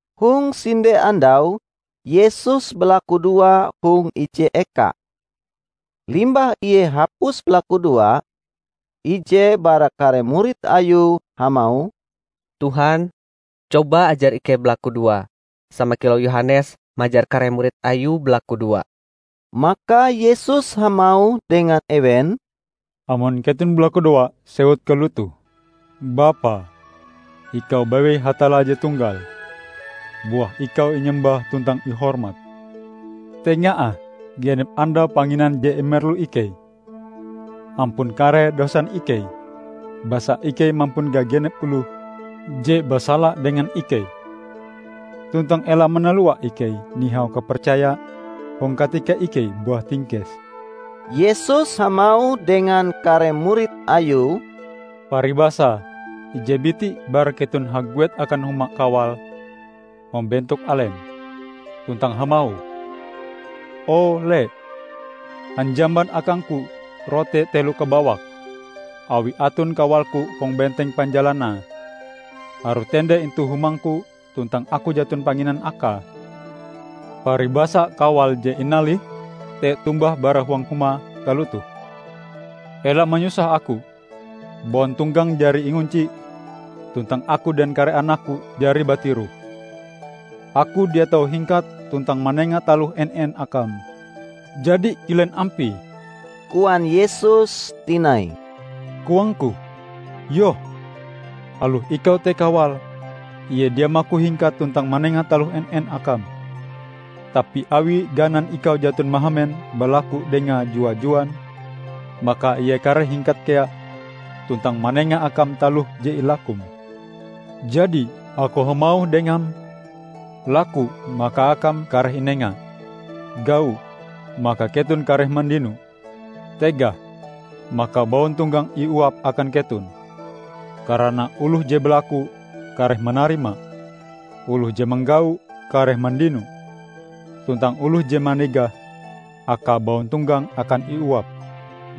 Hong sinde andau Yesus balakudoa hong ije eka. Limbah Ie hapus balakudoa, ije bara kare murid Ayue hamauh, "Tuhan, coba ajar ikei balakudoa sama kilau Yohanes majar kare murid Ayue balakudoa." Maka Yesus hamauh dengan ewen, "Amon keton balakudoa, sewut kalotoh, 'Bapa, Ikau bewei Hatalla je tunggal. Buah Ikau inyembah tuntang ihormat. Tenga ah genep andau panginan je imerlu ikei. Ampun kare dosan ikei, basa ikei mampun gagenep oloh je basala dengan ikei. Tuntang ela manalua ikei nihau kapercaya hong katika ikei buah tingkes.' " Yesus hamauh dengan kare murid Ayue, "Paribasae ije biti bara keton haguet akan human kawale hong bentok alem, tuntang hamauh, 'O, le, hanjaman akangku rote telo kabawak, awi aton kawalku hong benteng panjalanae, harue tende intu humangku tuntang aku jaton panginan akae!' Paribasa kawal je inalihm te tombah bara huang humae, kalotoh, 'Ela manyusah aku! Bauntonggang jari ingunci tuntang aku dengan kare anakku jari batiroh. Aku dia tau hingkat tuntang manenga taloh en-en akam.' " "Jadi kilen ampie?" koan Yesus tinai. "Koangku, Yoh! Aloh ikau te kawale, ie dia maku hingkat tuntang manenga taloh en-en akam. Tapi awi ganan ikau jaton mahamen balaku dengae jua-juan, maka ie kareh hingkat kea tuntang manenga akam taloh je ilakum. Jadi, Aku hamauh dengam: Laku, maka akam kareh inenga; gau, maka keton kareh mandino; tegah, maka bauntonggang iuap akan keton. Karana oloh je balaku kareh manarima; oloh je manggau kareh mandino, tuntang oloh je manegah, akae bauntonggang akan iuap.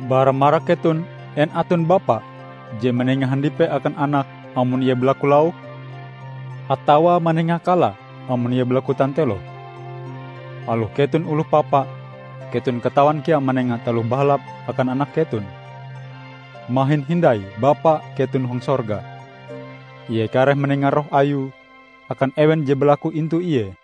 Bara marak keton en aton bapa je manenga handipe akan anake, amon ie balaku lauk? Atawa manenga kala amon ie balaku tanteloh? Aloh keton oloh papa, keton katawan kea manenga taloh bahalap akan anak keton. Mahin hindai Bapa keton hong sorga! Ie kareh manenga Roh Ayue akan ewen je balaku intu Ie!"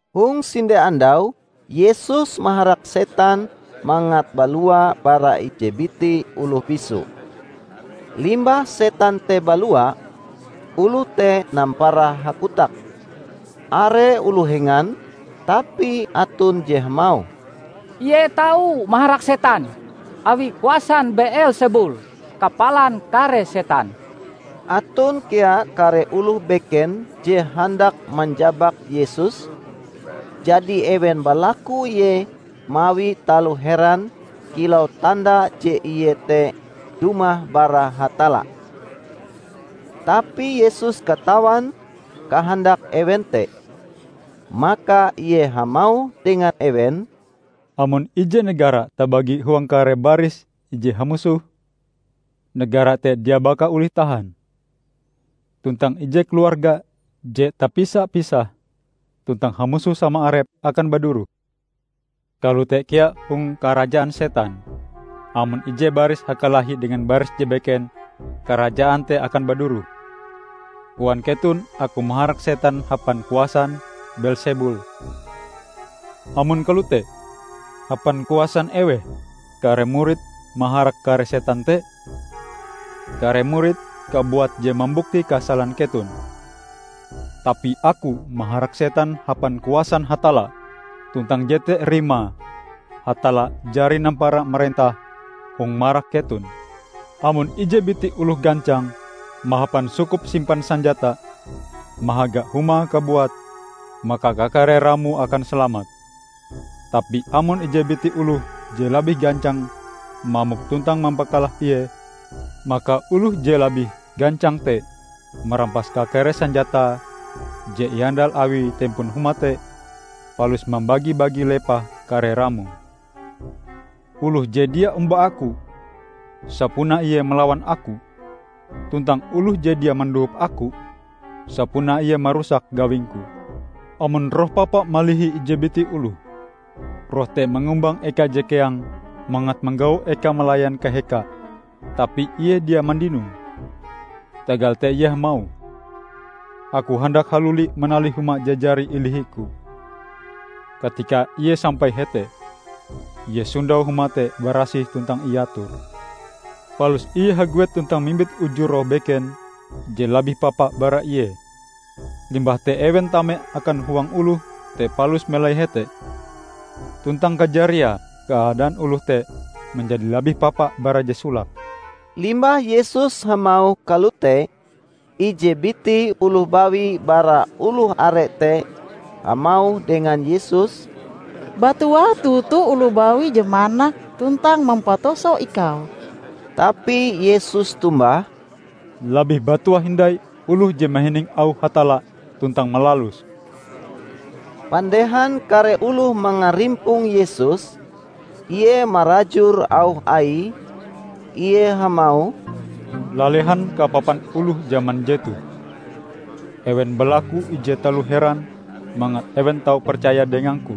Hong sinde andau Yesus maharak setan mangat balua bara ije biti oloh bisu. Limbah setan te balua, oloh te nampara hakotak. Are oloh hengan, tapi aton je hamauh, "Ie tau maharak setan, awi kuasan Beelsebul, kapalan kare setan." Aton kea kare oloh beken je handak manjabak Yesus, jadi ewen balaku Ie mawi taloh heran kilau tanda je Ie te dumah bara Hatalla. Tapi Yesus katawan kahandak ewen te. Maka Ie hamauh dengan ewen, "Amon ije negara tabagi huang kare baris ije hamusoh, negara te dia baka olih tahan. Tuntang ije keluarga je tapisa-pisah tuntang hamusoh sama arepe, akan baduroh. Kalote kea hong karajaan setan; amon ije baris hakalahi dengan baris je beken, karajaan te akan baduroh. Koan keton Aku maharak setan hapan kuasan Beelsebul. Amon kalote, hapan kuasan eweh kare muridm maharak kare setan te? Kare muridm kabuat je mambukti kasalan keton! Tapi Aku maharak setan hapan kuasan Hatalla, tuntang jete rimae Hatalla jari nampara marentah hong marak keton. Amon ije biti oloh gancang, mahapan sukup simpan sanjata, mahaga humae kabuat, maka kakare ramoe akan salamat. Tapi amon ije biti oloh je labih gancang mamok tuntang mampakalah ie, maka oloh je labih gancang te marampas kakare sanjata je iandal awi tempon huma te, palus mambagi-bagi lepah kare ramoe. Oloh je dia omba Aku, sapunae ie malawan Aku, tuntang oloh je dia mandohop Aku, sapunae ie marusak gawing-Ku!" "Amon roh papa malihi ije biti oloh, roh te mangumbang eka je keang mangat manggau ekae malayan kahekae, tapi ie dia mandinoe. Tagal te ie hamauh, 'Aku handak haluli manalih huma je jari ilihiku!' Katika ie sampai hete, ie sondau huma te barasih tuntang iator. Palus ie haguet tuntang mimbit uju roh beken je labih papa bara ie. Limbah te ewen tame akan huang oloh te palus melai hete. Tuntang kajariae keadaan oloh te manjadi labih papa bara je solake." Limbah Yesus hamauh kalote, ije biti oloh bawi bara oloh are te hamauh dengan Yesus, "Batuah toto oloh bawi je manak tuntang mampatuso Ikau!" Tapi Yesus tombah, "Labih batuah hindai oloh je mahining auh Hatalla tuntang malaluse!" Pandehan kare oloh mangarimpong Yesus, Ie marajur auh Aie, Ie hamauh, "Lalehan kapapan oloh jaman jetoh. Ewen balaku ije taloh heran mangat ewen tau percaya dengang-Ku,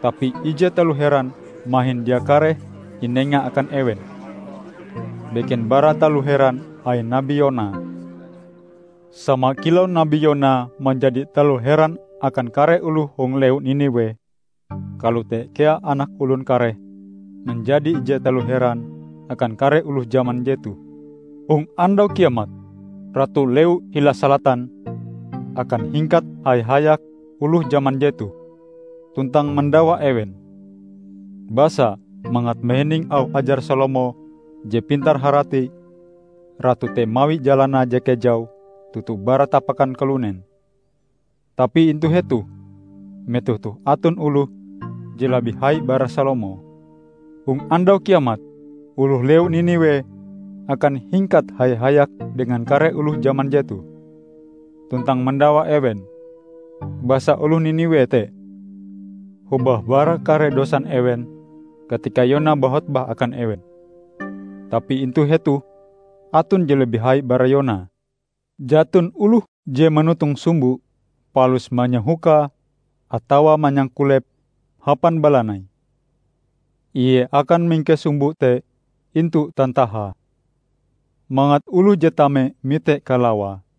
tapi ije taloh heran mahin dia kareh inenga akan ewen, beken bara taloh heran ain Nabi Yona. Sama kilau Nabi Yona manjadi taloh heran akan kare oloh hong lewu Niniwe, kalote kea Anak Olon kareh manjadi ije taloh heran akan kare oloh jaman jetoh. Hong Andau Kiamat, Ratu lewu hila Salatan akan hingkat haya-hayak oloh jaman jetoh, tuntang mandawa ewen. Basa, mangat mahining auh ajar Salomo je pintar harati, Ratu te mawi jalanae je kejau toto bara tapakan kalunen. Tapi intu hetoh metoh toh aton oloh je labih hai bara Salomo! Hong Andau Kiamat, oloh lewu Niniwe akan hingkat haya-hayak dengan kare oloh jaman jetoh, tuntang mandawa ewen, basa oloh Niniwe te hobah bara kare dosan ewen katika Yona bahotbah akan ewen. Tapi intu hetoh aton je labih hai bara Yona!" "Jaton oloh je manotong sumbo palus manyahokae atawa manyangkulepe hapan balanai. Ie akan mingkes sumbo te intu tantahae, mangat oloh je tame mite kalawae.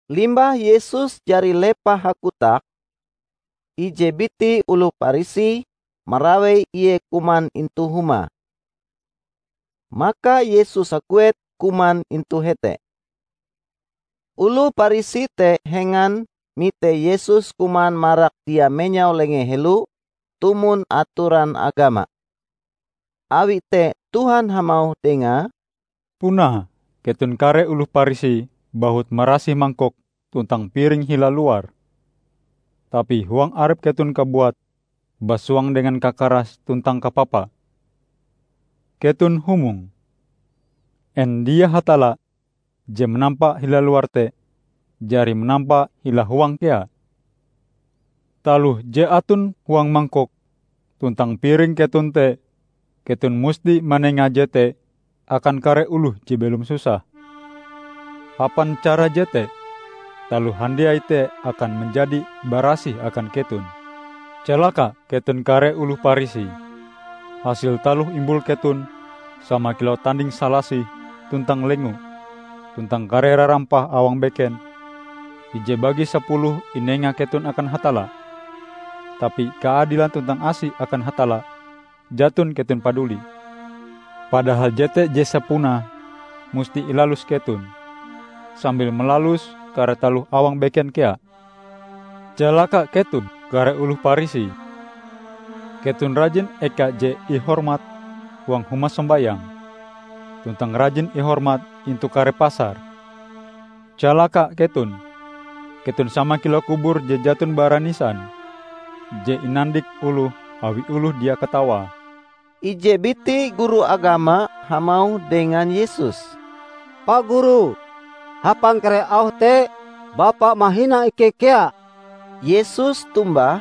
Limbah Yesus jari lepah hakotak, ije biti oloh Parisi marawei ie kuman intu humae. Maka Yesus haguet kuman intu hete. Oloh Parisi te hengan mite Yesus kuman marak dia menyau lengee helo tumon atoran agama. Awi te Tuhan hamauh dengae, "Punae keton kare oloh Parisi bahut marasih mangkok tuntang piring hila luare, tapi huang arep keton kabuat basuang dengan kakaras tuntang kapapa. Keton humong! En dia Hatalla je manampa hila luar te, jari manampa hila huange kea? Taloh je aton huang mangkok tuntang piring keton te keton musti manenga jete akan kare oloh je belom susah. Hapan cara jete, taloh handiai te akan manjadi barasih akan keton. Calaka keton kare oloh Parisi! Hasil taloh imbul keton sama kilau tanding salasih tuntang lengo tuntang kare rarampah awang beken, ije bagi sapuluhe inenga keton akan Hatalla, tapi kaadilan tuntang asi akan Hatalla jaton keton paduli. Padahal jete je sapunae musti ilalus keton, sambil malalus kare taloh awang beken kea. Calaka keton, kare oloh Parisi! Keton rajin eka je ihormat huang huma sombayang, tuntang rajin ihormat intu kare pasar. Calaka keton! Keton sama kilau kubur je jaton bara nisan, je inandik oloh awi oloh dia katawae." Ije biti guru agama hamauh dengan Yesus, "Pa Guru, hapan kare auh te, Bapa mahina ikei kea!" Yesus tombah,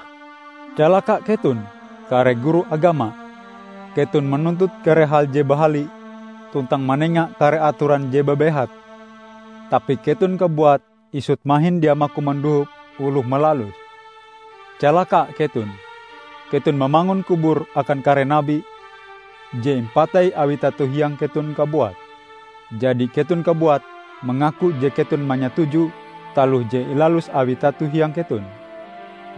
"Calaka keton, kare guru agama! Keton manuntut kare hal je bahali tuntang manenga kare atoran je babehat, tapi keton kabuat isut mahin dia maku mandohop oloh malaluse. Calaka keton! Keton mamangun kubur akan kare nabi, je impatei awi tato hiang keton kabuat. Jadi keton kabuat mangaku je keton manyatuju taloh je ilalus awi tato hiang keton;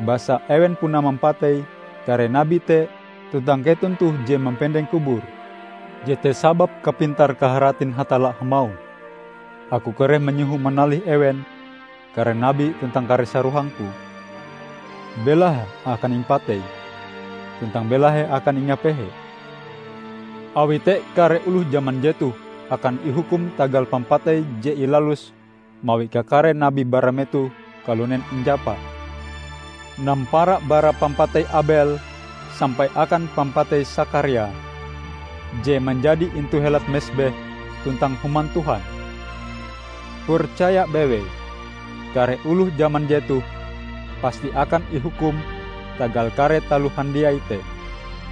basa ewen puna mampatei kare nabi te tuntang keton toh je mampendeng kubure. Jete sababe kapintar-kaharatin Hatalla hamauh, 'Aku kareh manyoho manalih ewen kare nabi tuntang kare sarohang-Ku; belahe akan impatei tuntang belahe akan ingapehe!' Awi te kare oloh jaman jetoh akan ihukum tagal pampatei je ilalus mawi kakare nabi bara metoh kalunen injapa, nampara bara pampatei Abel sampai akan pampatei Sakaria, je manjadi intu helat mesbeh tuntang Human Tuhan. Percaya bewei: Kare oloh jaman jetoh pasti akan ihukum tagal kare taloh handiai te.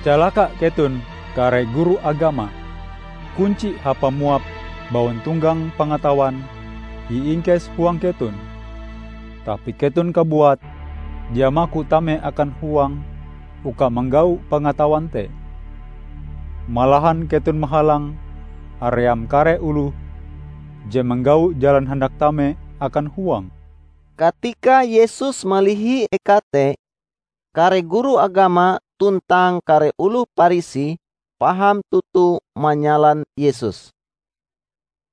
Calaka keton, kare guru agama! Kunci hapa muap bauntonggang pangatawan iingkes huang keton, tapi keton kabuat dia maku tame akan huang uka manggau pangatawan te. Malahan keton mahalang haream kare oloh je manggau jalan handak tame akan huange!" Katika Yesus malihi eka te, kare guru agama tuntang kare oloh Parisi paham toto manyalan Yesus.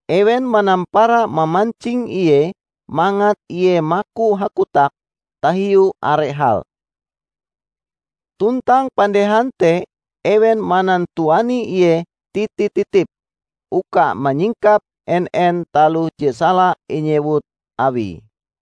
Ewen manampara mamancing Ie mangat Ie maku hakotak tahiu are hal. Tuntang pandehan te ewen manantuani ie titi-titip uka manyingkap en-en taloh je sala inyewut Awie.